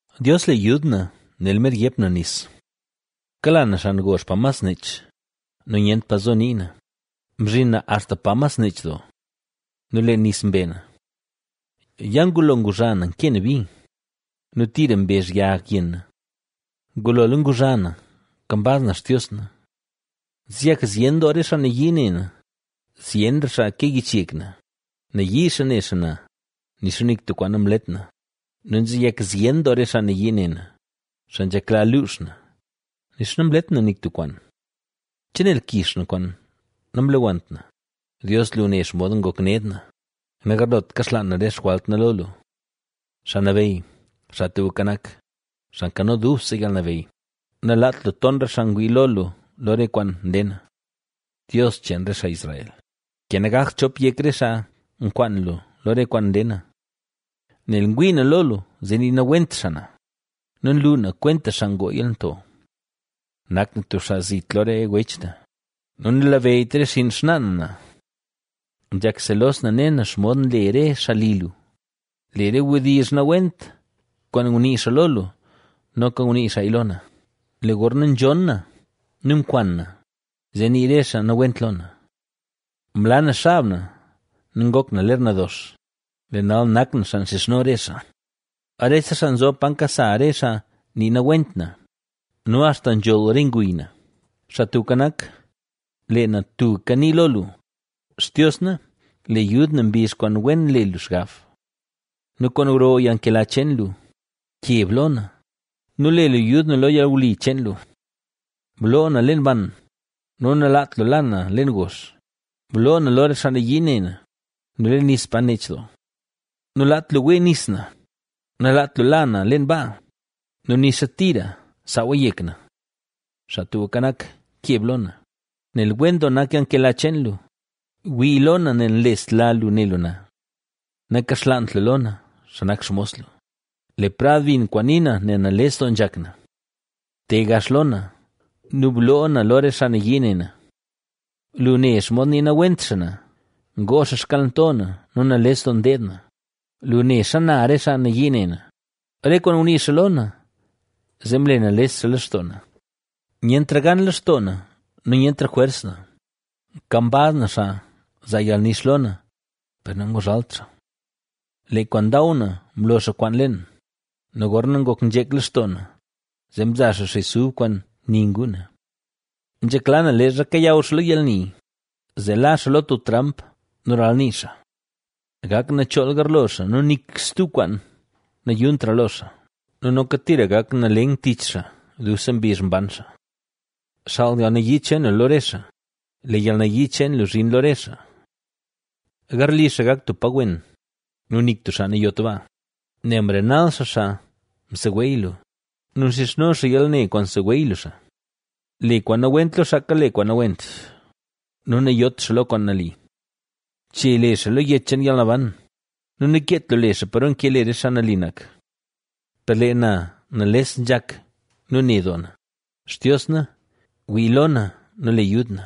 Dios, le yud na, nel mer yep na nis. Kala na xan gozh pa mas nech nu nyent pa zo nii na. Mzhin na axta pa mas nech doo, nu lee nis mbe na. Ya ngulo nguzha na nkee na bi nu tira mbezh yag yenn na. Ngulola nguzha na, kambaz na Xtios na. Nzeyak zyen doo re xaa nayii ne na, zyenra xaa ke yich yek na; nayii xaa ne xaa na, nixa nik tub kwaan namlet na nu nzeyak zyen doo re xaa nayii ne na, xaa nzhekla luux na, nixa namlet na nik tub kwaan. ¿Chenel kix na kwaan namlewannt na? Dios lu ne xomod ngok ned na; nagarlot kaxlaan na re xjwalt na lo lu. Xaa Nabeyy, Xaa Tubka Nak, Xaa Nkano Dubse Yalnabeyy, nalaat lu ton re xaa ngwii lo lu lo re kwaan nle na. Dios cheen re xaa Israel, ke nagakt chop yek re xaa nkwaan lu lo re kwaan nle na. Nel ngwii na lo lu, zee nii nawent xaa na nu nlu na kwenta xaa ngoo yalnto. Nak na tub xaa zit lo re wech na nu nanlabeyyt re xinn xnaa na na. Nzhak selos na ne na xomod nle re xaa li lu; lee re wdizh nawent kwaan ngunii xaa lo lu, noka ngunii xaaya lo na. Lee gorna nzhon na nu nkwan na, zee nii re xaa nawent lo na. Mla na xab na nu ngok na ler nadox, lee nal nak na xaa xizhno re xaa. Rese xaa nzob paro nkasa re xaa nii nawent na ¡nu axta nzholl re nguy na! Xaa Tubka Nak, lee na tubka ni lo lu. Xtios na, le yud na mbizh kwaan wen le lu xgab. Nu kwaan gro yalnkela cheen lu, ¡keb lo na! nu le lu yud na lo yalwli cheen lu. Bloo na leen ban, nu nalaat lu la na leen gozh. Bloo na lo re xaa nayii ne na nu leen nis pa nech doo. Nalaat lu wee nis na; nalaat lu la na leen baa nu nixa tira saawa yek na. Xaa Tubka Nak, keb lo na, nel wen doo nak yalnkela cheen lu; wii lo na nel nlesla lu ne lu na. Nakaxlaant lu lo na, xaa nak xmos lu, le prad bin kwaan nii na, nel nales doo nzhak na. Te gax lo na nu bloo na lo re xaa nayii ne na. Lu ne xomod nii nawent xaa na, ngoo xaa xkalnto na nu nales doo ndeed na; lu ne xana re xaa nayii ne na. Re kwaan ngunii xaa lo na, zee mle nales xaa lextoo na; nyentra gan lextoo na nu nyentra jwers na, nkambaz na xaa zaa yalnix lo na, per nanguzhalt xaa. Lee kwaan ndaw na, mlo xaa kwaan leen nu gorna ngok nzhek lextoo na, zee mzaa xaa xis ub kwaan ni nguu na. Nzhekla na leezha kayaw xaa lo yalni, zee la xaa lo tub tramp nu ralnii xaa. Gak nachool garlo xaa nu nik stub kwaan nayuntra lo xaa nu noka tira gak nalen tich xaa dubse mbizh mban xaa. Xaal yalnayii cheen lu lo re xaa; lee yalnayii cheen lu zhin lo re xaa. Garli xaa gak tub pa wen nu nik tub xaa nayot baa. Nel mrenal xaa xaa mseweey lu nu nxizhno xaa yalne kwaan mseweey lu xaa. Le kwaan nawent lo xaa kale kwaan nawent nu nayot xaa lo kwaan nali. Che le xaa lo yech cheen yalnaban, nakeet lu le xaa paro nke le re xaa nali nak. Per lee na nales nzhak nu ne doo na, Xtios na, wii lo na nu le yud na.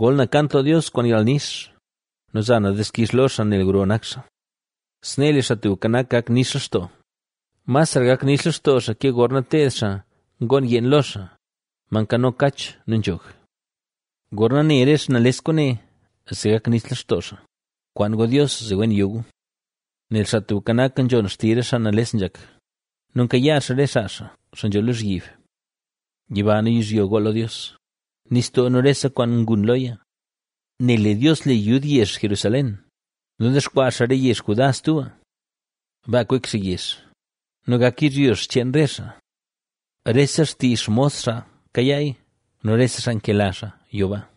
Gol na kant lo Dios kwaan yalnix, nu za na dixkix lo xaa nel gro nak xaa. Snee lee Xaa Tubka Nak gak nix lextoo, masra gak nix lextoo xaa ke gorna teed xaa ngoon yeen lo xaa, ma nkano kach nu nzhog. Gorna ne re xaa nales kwaane, zee gak nix lextoo xaa; kwaan gu Dios zee wen yo gu. Nel Xaa Tubka Nak nzhon xtizh re xaa nales nzhak nu nkayaa xaa re xaa xaa, xaa nzho lozhyib. Yiba nu yizhyo gool lo Dios, nistoo nu rese kwaan ngun loya. Nel lee Dios le yud yezh Jerusalén nu dexkwaa xaa re yezh Judá stuba. Baa kwek xaa yezh nu gak yizhyo xcheen re xaa. Rese xtii xmos xaa kayaaya nu rese xaa nkela xaa yo baa.